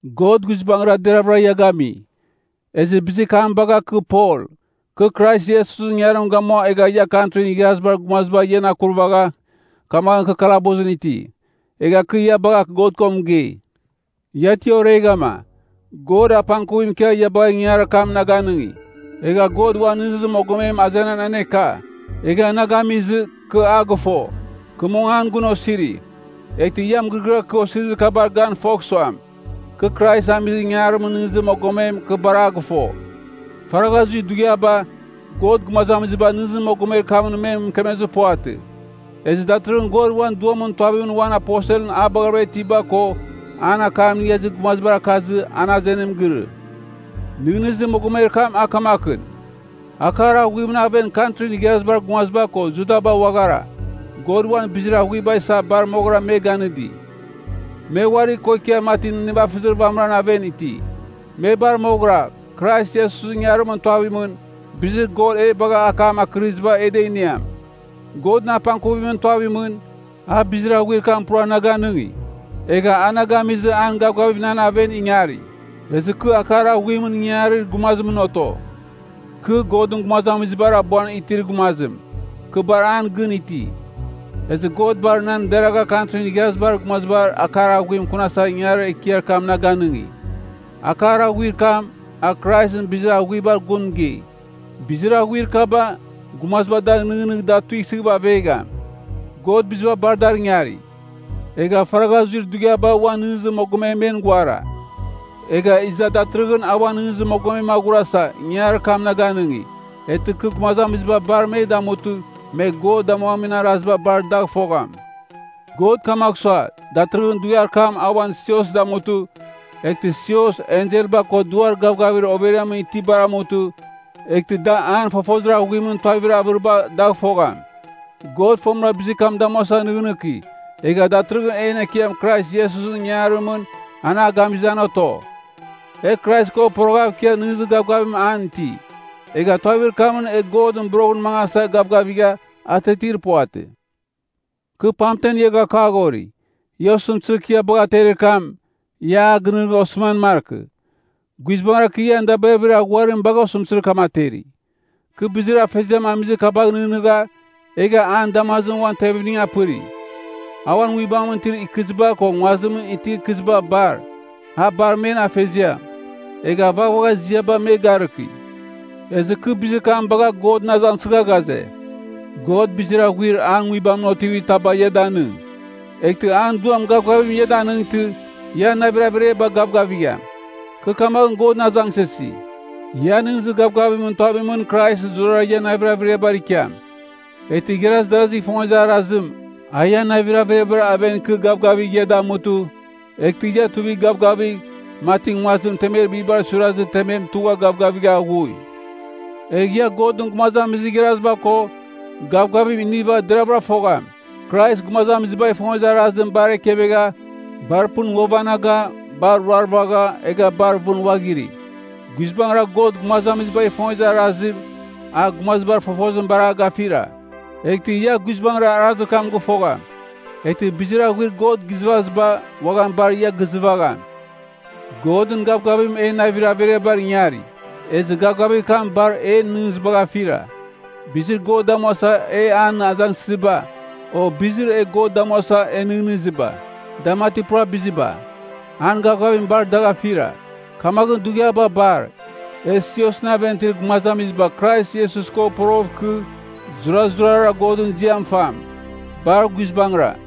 God guizbangɨra deravɨra ia gami. Ezɨ bizir kam bagha kɨ Pol, kɨ Krais Iesusɨn ingangarim gamua egha ia Kantrin Igharazibar Gumaziba ian akurvagha, kamaghɨn kɨ kalabusɨn iti. Egha kɨ ia bagha God ko mɨgei. Ia ti oreghama, God apangkuvim ikia ia bagha ingangarir kam na ganɨngi. Egha God uan nɨghnɨzir mogomem azenan aneka, egha na gamizɨ, kɨ a gɨfo. Kɨ mong an gun osiri, eghtɨ ia mɨgɨrɨgɨar kɨ osirizibar ganɨva fogh suam, kɨ Krais amizir ingangarimɨn nɨghnɨzir mogomem, kɨ bar a gɨfo. Faragha zuir dughiaba, God gumazamiziba nɨghnɨzir mogomer kamɨn me mɨkemezir puvatɨ. Ezɨ datɨrɨghɨn God uan Duamɨn tuavimɨn uan aposelɨn a baghavɨra itiba ko an akam inigha izir gumazibar akazɨ an azenim girɨ. Nɨghnɨzir mogomer kam a kamakɨn: Akar aghuimɨn aven Kantrin Igharazibar Gumaziba ko Judaba uaghara, God uan bizir aghuiba isa bar moghɨra me ganɨdi. Me uari ko ikia mati nivafɨzir vamɨran aven iti. Me bar moghɨra, Krais Iesusɨn ingangarimɨn tuavimɨn, bizir God e bagha akam akɨriziba e da iniam. Godɨn apangkuvimɨn tuavimɨn, a bizir aghuir kam pura na ganɨngi, egha a na gamizɨ an gavgavim nan aven ingari, ezɨ kɨ akar aghuimɨn ingangarir gumazimɨn oto. Kɨ, Godɨn gumazamizibar abuan itir gumazim, kɨ bar an gɨn iti. Ezɨ God bar nan deragha Kantrin Igharazibar Gumaziba akar aghuim akunasa ingangarir ekiar kam na ganɨngi. Akar aghuir kam, a Kraisɨn bizir aghuibar gun mɨgei. Bizir aghuir kaba, gumaziba dagh nɨghnɨgh da tuisɨghɨva avegham. God biziba bar dar ingari, egha faragha zuir dughiaba uan nɨghnɨzir mogomem men ghuara. Egha iza datɨrɨghɨn a uan nɨghnɨzir mogomem aghurasa, ingangarir kam na ganɨngi, eghtɨ kɨ gumazamiziba bar me damutɨ me God damuamin araziba bar dagh fogham. God kamagh sua, datɨrɨghɨn dughiar kam a uan sios damutɨ, eghtɨ sios, enselba ko duar gavgavir overiamɨn itibar amutɨ, eghtɨ da an fofozir aghuimɨn tuavir avɨriba dagh fogham. God fomɨra bizir kam damuasa nɨghnɨki egha datɨrɨghɨn en Ekiam Krais Iesusɨn ingangarimɨn an a gamizɨ an oto. E Krais ko poroghav ikia nɨghnɨzir gavgavim an iti, egha tuavir kamɨn e Godɨn boroghɨn mangasa gavgavigha, atiatir puvatɨ. Kɨ pamtem ia gakaghori, ia osɨmtɨzir kɨ ia bagha aterir kam, ia a gɨnɨghnɨgh osɨman markɨ. Guizbangɨra kɨ ian dabirabir aghuarim bagha osɨmtɨzir kam ateri. Kɨ bizir Afeziam amizir kabagh nɨghnɨgha, egha an damazimɨn uan tevimning apɨri. A uan Nguibamɨn itir ikɨziba ko nguazimɨn itir ikɨziba bar, a bar men Afeziam. Egha vaghvagha ziaba me garɨki. Ezɨ kɨ bizir kam bagha Godɨn azangsɨgha ghaze, God bizir aghuir an Nguibamɨn otivir taba ia danɨng, eghtɨ an Duam gavgavim ia danɨngtɨ, ian navir averiaba gavgavigham. Kɨ kamaghɨn Godɨn azangsɨsi, ian nɨghnɨzir gavgavimɨn tuavimɨn Krais zurara ian navir averiabar ikiam. Eghtɨ igharaz darazigh ifongezir arazim, a ian navir averiabar aven ikɨ gavgavigh ia damutɨ, eghtɨ ia tuivigh gavgavigh, mati nguazim temer bibar suirazɨ temem tugha gavgavigha aghui. Egh ia Godɨn gumazamizir igharaziba ko, gavgavim iniva deravɨra fogham, Krais gumazamizibagh ifongezir arazim bar ekevegha, bar pɨn ghuavanaga, bar ruarvagha, egha bar vɨn uaghiri. Guizbangɨra God gumazamizibagh ifongezir arazim a gumazibar fofozim bar a gafira. Eghtɨ ia guizbangɨra arazir kam gɨfogham. Eghtɨ bizir aghuir God gizɨvaziba, uaghan bar ia gizɨvagham. Godɨn gavgavim en navir averiabar ingari, ezɨ gavgavir kam bar en nɨghnɨzibagh afira. Bizir God damuasa e an azangsɨziba, o bizir e God damuasa e nɨghnɨziba, da mati pura biziba, an gavgavim bar dagh afira. Kamaghɨn dughiaba bar, e siosɨn aven itir gumazamiziba Krais Iesus ko poroghɨv ikɨ, zurazurara Godɨn ziam fam! Bar guizbangɨra.